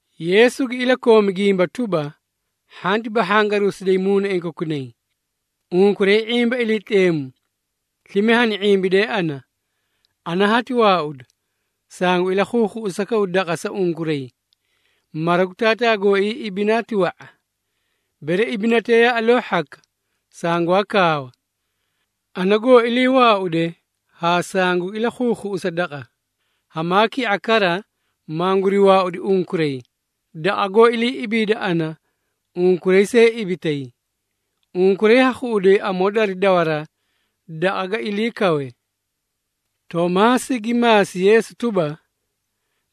Yeesu gi ilakoomi gimba tuba, “Hhanti bahhangaruusidayi muunaiĩ kokunay. Unkuray ⁄imba Iliitleemu, slime hani ⁄imbidee ana. Ana hati waauda, sangu ilakhuukhuꞌusakaw daqa sa unkuray. Mara gu Taataa gooii ibinaa ti wa⁄a. Bere ibinatee yaa aloo hhaka, sangwaa kaawa. Ana goo ilii waauude haa sangugi ilakhuukhuꞌusa daqa, hamaa ki⁄a kara manguri waaudi unkuray, daqa goó ilii ibiide ana, unkuray see ibitay. Unkuray ha khuꞌuday amoo dari dawaraa daqa ga kawe.” Toomaasi gi maasi Yeesu tuba,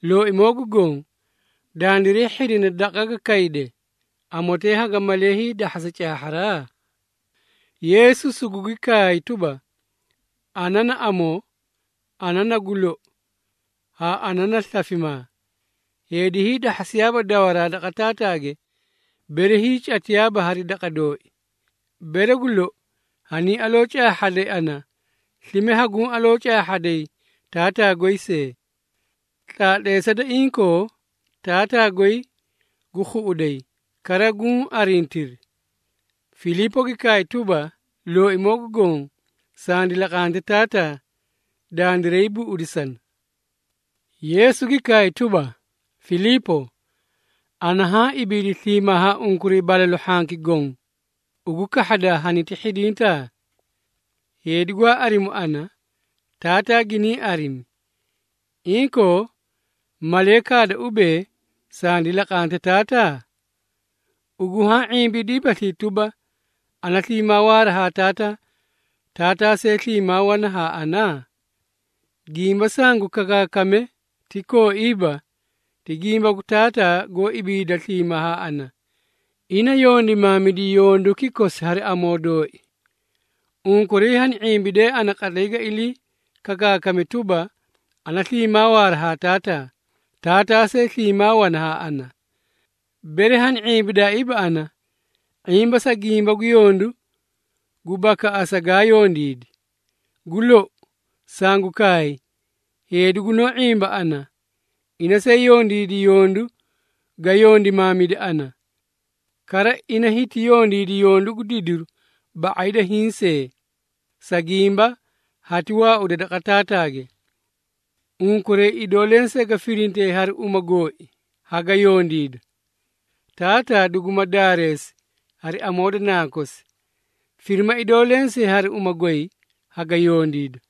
“Looimoo gu Goõ, dandiray hhidina daqa ga kayde, amotee haga malee hiidahhasa caahharaa?” Yeesu sugugi kaay tuba, “Ana na amoo, ana na gu lou, haa ana na slafimaa. Heedi hiidahhasiyaa dawaraa daqa Taataage, bere hiicatiyaaba hari daqa dooi. Bere gu lou hanii aloo caahhaday ana, slime haguũ aloo caahhaday Taataa goy see. Tlaatleesa da inkoo, Taataa goy gu khuꞌuday, kara guũ arintiri.” Filiipo gi kaay tuba, “Looimoo gu Goõ, sandi laqante Taataa, dandiray buꞌudisana.” Yeesu gi kaay tuba, “Filiipo, ana haã ibiidi sliimaa haa unkuray balalu hhanki goõ, ugu kahhadaa haniti hhidintaa? Heedi gwaa arimu ana, Taataa giniĩ arimi. Inkoo, malee kaada ubee, ‘Sandi laqante Taataa?’ Ugu haã ⁄imbidaabaslii tuba, ana sliimaa waara haa Taataa, Taataa see sliimaa wana haa ana? Gimba sangu kakaakaame ti kooiiba, ti gimba gu Taataa goó ibiida sliimaa haa ana. Ina yondimaamidi yonduki kosi hari amoo dooi. Unkuray hani ⁄imbidee ana qatlay ga ilii kakaakame tuba, ana sliimaa waara haa Taataa, Taataa see sliimaa wana haa ana. Bere hani ⁄imbidaaiiba ana, ⁄imba sa gimba gu yondu gu bakaꞌasa gaa yondiidi. Gu lou, sangu kaay, heedi gunoó ⁄imba ana, ina see yondiidi yondu ga yondimaamide ana. Kara, ina hiti yondiidi yondu gu didiru ba⁄ay da hiĩ see, sa gimba hati waauda daqa Taataage. Unkuray idoo lensee ga firintee hari uma gooi, haga yondiida, Taataa duguma daareesi hari amoo da Nankosi. Firima idoo lensee hari uma goy, haga yondiida.”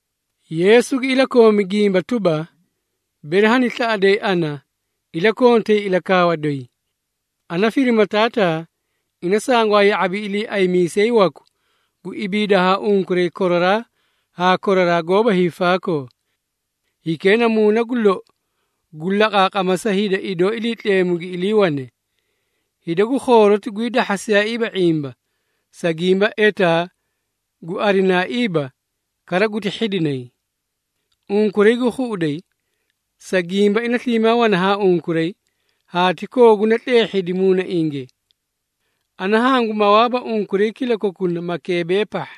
Yeesu gi ilakoomi gimba tuba, “Bere hani slaꞌaday ana, iliikontay ilakaawa doyi. Ana firima Taataa, ina sangwaa ya⁄abi Iliiaymiisay waku gu ibiida haa unkuray koraraa haa koraraa goóba hiifaakoo. Hikee na Muuna gu lou gu laqaaqama sa hida idoo Iliitleemu gi iliiwane. Hida gu khooroti gwii dahhasiyaaiiba ⁄imba, sa gimba etaa gu arinaaiiba kara guti hhidinay. Unkuray gu khuꞌuday, sa gimba ina sliimaa wana haa unkuray haa ti kooguna tleehhidi muunainge. Ana hangu mawaaba unkuray kilakokuna makeebee pahha,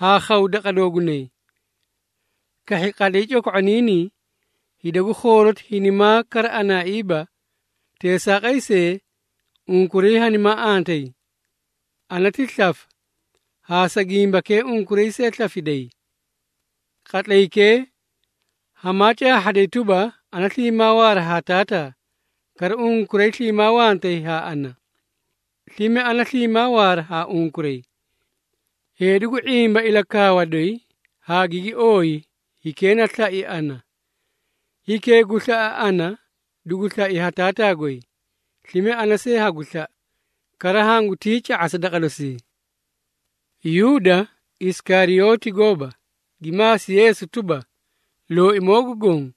haa khaw daqa doogunay. Kahhi qatlay coko⁄oniinii, hida gu khooroti hinimaa kara anaaiiba, teesaaqay see unkuray hanimaa antayi. Ana ti slafa, haa sa gimbakee unkuray see slafiday. Qatlaykee, hamaa caahhaday tuba, ana sliimaa waara haa Taataa, kara unkuray sliimaa wantay haa ana, slime ana sliimaa waara haa unkuray. Heedi gu ⁄imba ilakaawa doyi haa gigi ooyi, hikee na slai ana. Hikee gu slaꞌa ana, dugu slai ha Taataa goy, slime ana see hagu slaꞌa, kara hangutii ca⁄asa daqa dosii.” Yuuda (Isikariyooti gooba) gi maasi Yeesu tuba, “Looimoo gu Goõ,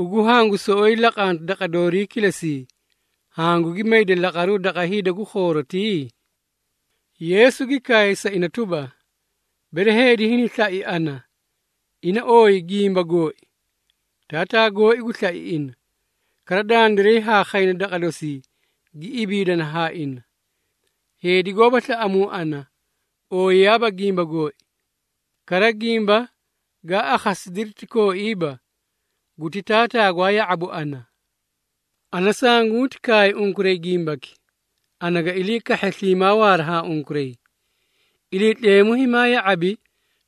ugu hangu soꞌoyi laqanta daqa doorii kilesii, hangugi mayda laqaru daqa hida gu khoorotii?” Yeesu gi kaay sa ina tuba, “Bere heedi hini slai ana, ina ooyi gimba gooi. Taataa gooi gu slai ina, kara dandiray haa khayna daqa dosii gi ibiidana haa ina. Heedi goóba slaꞌamuu ana, ooyiyaaba gimba gooi. Kara, gimba gaa akhasidiri ti kooiiba, guti Taataa gwaa ya⁄abu ana. Ana sanguti kaay unkuray gimbaki, ana ga ilii kahhe sliimaa waara haa unkuray. Iliitleemu himaa ya⁄abi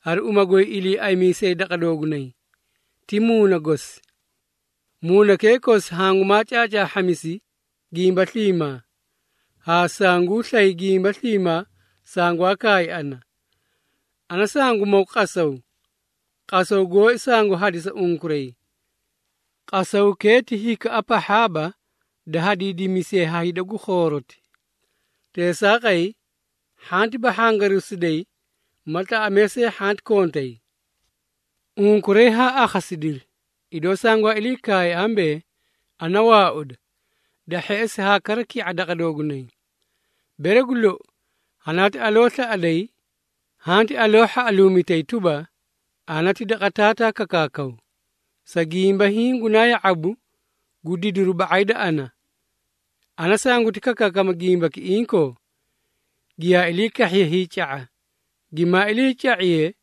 hari uma goy Iliiaymiisay daqa doogunay, ti Muuna gosi. Muunakee kosi hangu caacaahhamisi gimba sliimaa, haa sanguu slay gimba sliimaa sangwaa kaay ana. Ana sangu maw qasaw, qasaw gooi sangu hadisa unkuray. Qasawkee ti hikaꞌa pahhaaba da hadiidimisiye ha hida gu khooroti. Teesaaqay, hhanti bahhangaruusidayi ma tlaꞌamee see hhanti kontay. Unkuray haa akhasidiri, idoo sangwaa ilii kaay ambee, ‘Ana waauda, da hheꞌesi haa kara ki⁄a daqa doogunay.’ Bere gu lou, hanaati aloo slaꞌaday, hanti aloo hhaꞌaluumitay tuba, ana ti daqa Taataa kakaakaw, sa gimba hiĩ gunaa ya⁄abu gu didiri ba⁄ay da ana. Ana sanguti kakaakama gimbaki inkoo, giyaa ilii kahhiye hiica⁄a, gimaa iliica⁄iye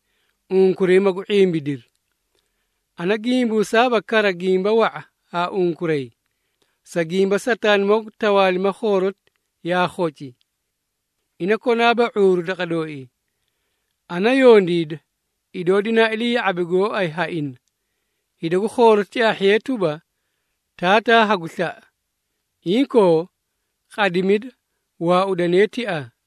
unkuray, magu ⁄imbidiri. Ana gimbuusaaba kara gimba wa⁄a haa unkuray, sa gimba Sataanimoo gu tawaalima khooroti yaa khoci. Ina konaaba ⁄uuru daqa dooii. Ana yondiida, idoo dinaa ilii ya⁄abi gooay haa ina, hida gu khooroti caahhiyee tuba, Taataa hagu slaꞌa. Inkoo, qadimida, waaudanee tiaa.”